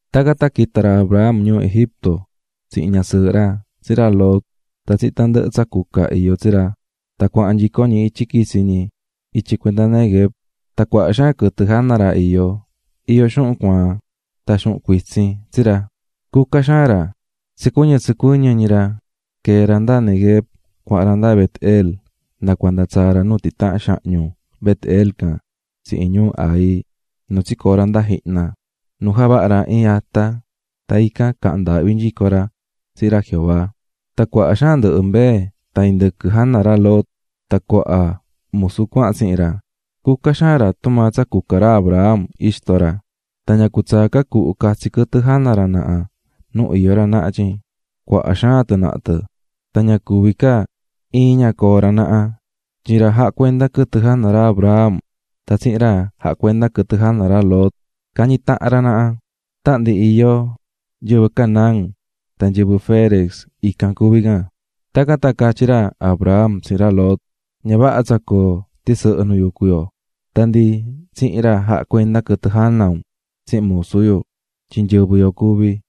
Tacan tan quita̱ ra Abram ñuu Egipto, tsihin ñasɨɨhɨ ra, tsihin ra Lot, tan tsihin tandɨhɨ tsa cuca iyó tsi ra, tan cuahan nyico ñi ityi cuenda Neguev. Tan cuaha xaan quɨtɨ jana ra iyó, iyó xuhun cuaan tan xuhun cuitsin tsi ra, cuca xaan ra. Tsa quita̱ ñi cuenda Neguev tsicuɨñɨ́ tsicuɨñɨ́ ñi ñi cuahan ñi nda Bet-el nda cuanda tsaa̱ ñi nu titahan xahñu Bet-el can tsihin ñuu Hai, nu tsicoo̱ ñi nda jihna, nu javaha̱ ra iin ata, tan ican caha̱n ndaahvi nyico ra tsihin ra Jehová. Tan cuaha xaan mbee tan indɨquɨ jana ra Lot tan cuaha musu cuahan tsihin ra. Cuca xaan ndɨhɨ ra tumaa cuca ra Abram, ixto ra. Tan ña cutsaa ca cuhu catsi quɨtɨ jana ra naha nu iyó ra naha tyin cuaha xaan tɨ naha tɨ, tan ña cuví ca coo ra naha iin ñi nu coo ra naha, tyin ra jacuendá quɨtɨ jana ra Abram tan ra jacuendá quɨtɨ jana ra Lot cañí tahan ra naha. (Tahan ndi iyó nyɨvɨ Canaán tan nyɨvɨ Ferez ican cuví can.) Tacan tan catyí ra Abram tsihin ra Lot: "Ña vaha tsa coo tisɨhɨ nu yucú yo, tan ndi tsihin ra jacuendá quɨtɨ jana un tsihin musu yu, tyin nyɨvɨ yo cuví.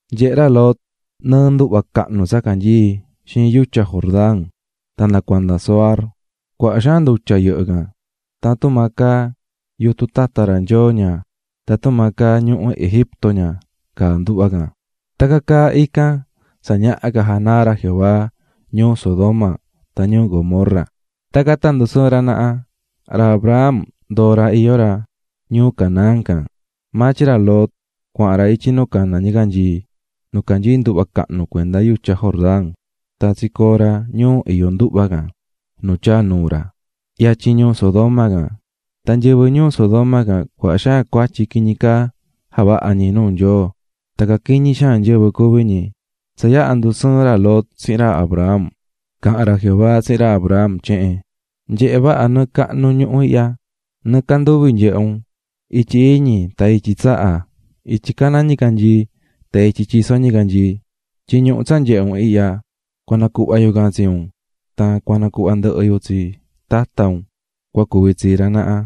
Nyehe̱ ra Lot nɨɨ nduhva cahnu tsa canyií xiin yutya Jordán tan nda cuanda Zoar, cuaha xaan ndutya yɨhɨ́ can. Tan tumaa caá yutun tata ra Nyoo ña, tan tumaa caá ñuhu Egipto ña caá nduhva can. Tacan caá ican tsa ñaha ca janaa ra Jehová ñuu Sodoma tan ñuu Gomorra. Tacan tan ndusɨɨ̱n ra naha. Ra Abram ndoo̱ ra iyó ra ñuu Canaán can. Maa tyin ra Lot cuahan ra ityi nu caná ñicanyii nu canyií nduhva cahnu cuenda yutya Jordán, tan tsicoo̱ ra ñuu iyó nduhva can, nu tyaa̱ nuu ra, yatyin ñuu Sodoma can. Tan nyɨvɨ ñuu Sodoma can cuaha xaan cuatyi quiñi caa javahá ñi nuu Nyoo, tan nyɨvɨ caquiñi xaan cuví ñi. Tsa yaha ndusɨɨ̱n ra Lot tsihin ra Abram, caha̱n ra Jehová tsihin ra Abram tyehen: "Nye̱he vaha nɨɨ cahnu ñuhu ihya, nɨɨ canduvi nye̱he un, ityi iñi tan ityi tsaha, ityi caná ñicanyii, tan ityi tyisó ñicanyii. Tyin ñuhu tsa nyehé un ihya, cua nacuhva yu can tsi un tan cua nacuhva ndɨhɨ yu tsi tata un cua cuvi tsii ra naha.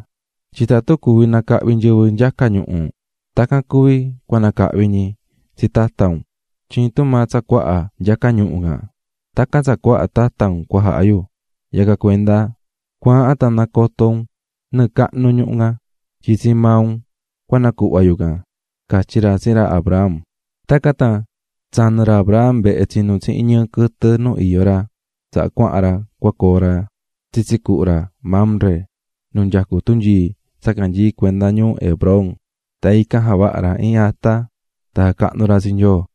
Tyin tatun cuvi nacahvi nyɨvɨ nyaca ñuhu, tacan cuvi cua nacahvi ñi tsi tata un, tyin tumaa tsa cuaha nyaca ñuhu can, tacan tsa cuaha tata un cua jaha yu. Yacan cuenda ¡Cua̱ahan tan nacoto un nɨɨ cahnu ñuhu can, tyin tsii maa un cua nacuhva yu can!", catyí ra tsihin ra Abram. Tacan tan tsanɨ̱ ra Abram vehe tsinú tsihin ñɨɨ quɨtɨ nu iyó ra, tsaha cuahan ra cua coo ra tsitsi cuhu ra Mamre nu nyacú tunyii tsa canyií cuenda ñuu Hebrón. Tan ican javaha̱ ra iin ata tan jacahnu̱ ra tsi Nyoo.